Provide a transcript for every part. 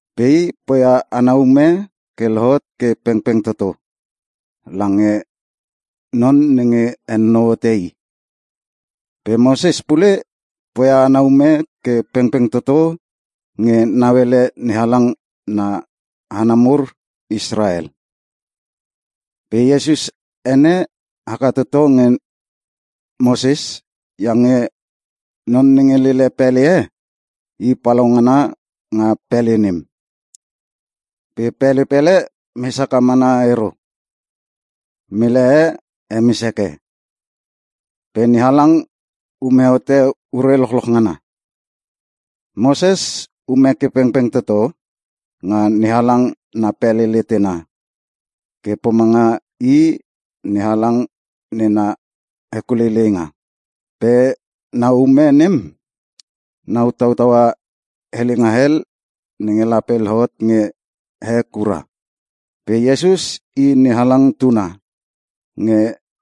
Pe i poia ana ume ke lohot ke pengpeng toto lange Non nenge henonou hote i. Pe Moses pule poia ana ume ke pengpeng toto nge nauele NeHalang na hana mur Israel. Pe Iesus ene haka toto nge Moses iange non nenge lele pele e, i palaungana nga pele nem. Pele pele mes haka mana ero. Mele e hemes heke. Pe NeHalang ume hote ure lochloch ngana. Moses ume ke pengpeng toto nga NeHalang na pele letena ke pomanga I NeHalang nena hekuleileinga. Pe na ume nem nau tautaua helenga hel nge lape lohot nge he kura. Pe Iesus i NeHalang tuna nge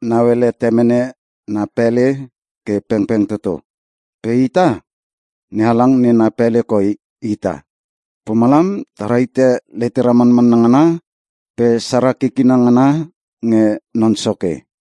nauele temene na pele ke pengpeng toto. Pe ita, NeHalang nena pele koi ita. Pomalam ta rahite letera manmanna ngana pe sara kikina ngana nge Non Soke.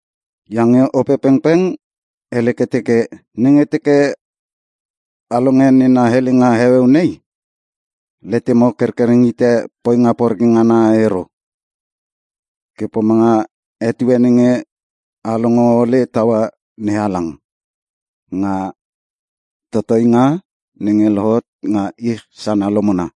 Iange Opepengpeng hele ke teke, “Nenge teke a longe nena helenga heueu nei, letemo kerkereng hite poinga poreke ngana ero, ke pomanga etue nenge a longo ole taua NeHalang nga totoinga nenge lohot nga ich sana lomona.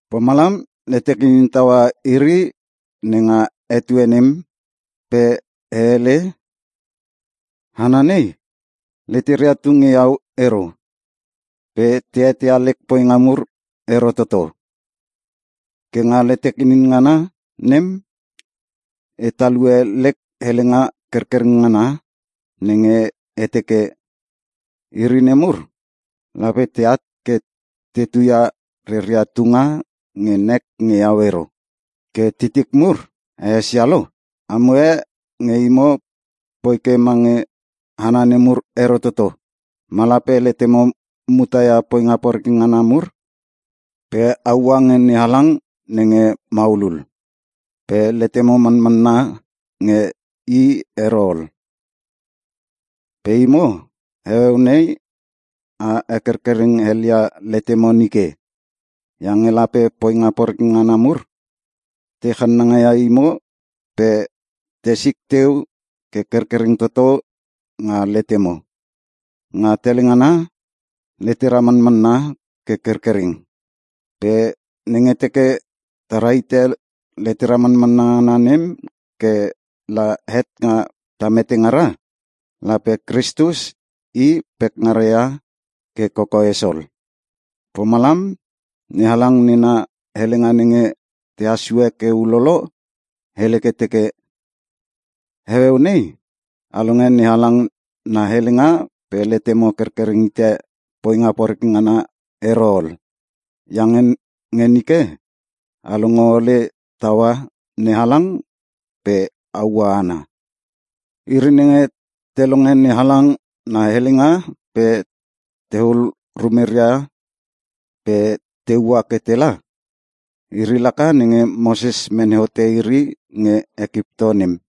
Pomalam letek inin taua iri nenga etue nem pe e hele, ‘Hana nei, leteria tu nge iau ero pe te eteia lek poinga mur ero toto.’ Ke nga letek inin ngana nem, e talue lek helenga kerkereng ngana nenge e teke, ‘Iri nemur lape teat ke te tuia reria tunga nge nek nge iau ero.’” Ke titik mur a esia lo? Amo e nge imo poi ke mange hana nemur ero toto. Ma lape letemo muta nga poinga poreke ngana mur pe a ua nge NeHalang nenge maulul, pe letemo manmanna nge I ero ol. Pe imo, heueu nei a hekerkereng helia letemo nike, iange lape poinga poreke ngana mur, te channanga ia imo pe te sik teu ke kerkereng toto nga letemo. Nga tele ngana, letera manmanna ke kerkereng. Pe nenge teke ta rahite letera manmanna ngana nem ke la het nga ta mete ngara, lape Kristus i pekngara ia ke kokoes ol. Pomalam, NeHalang nena helenga nenge tehas sue ke ulolo, hele ke teke, “Heueu nei, a longe NeHalang na helenga pe letemo kerkereng hite poinga poreke ngana ero ol. Iange nge nike a longo ole taua NeHalang pe a ua ana.” Iri nenge te longe NeHalang na helenga pe tehul rumeria pe te ua ke tela, iri laka nenge Moses mene hote iri nge Ekipto nem.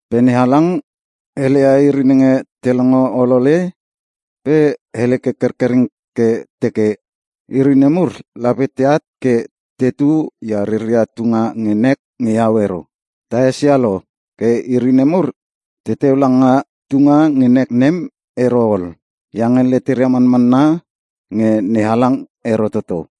Pe NeHalang heleia iri nenge te longo olole pe hele ke kerkereng ke teke, “Iri nemur lape teat ke tetu ia reria tunga nge nek nge iau ero.” Ta esia lo ke iri nemur teteu langa tunga nge nek nem ero ol, iange leteria manmanna nge NeHalang ero toto.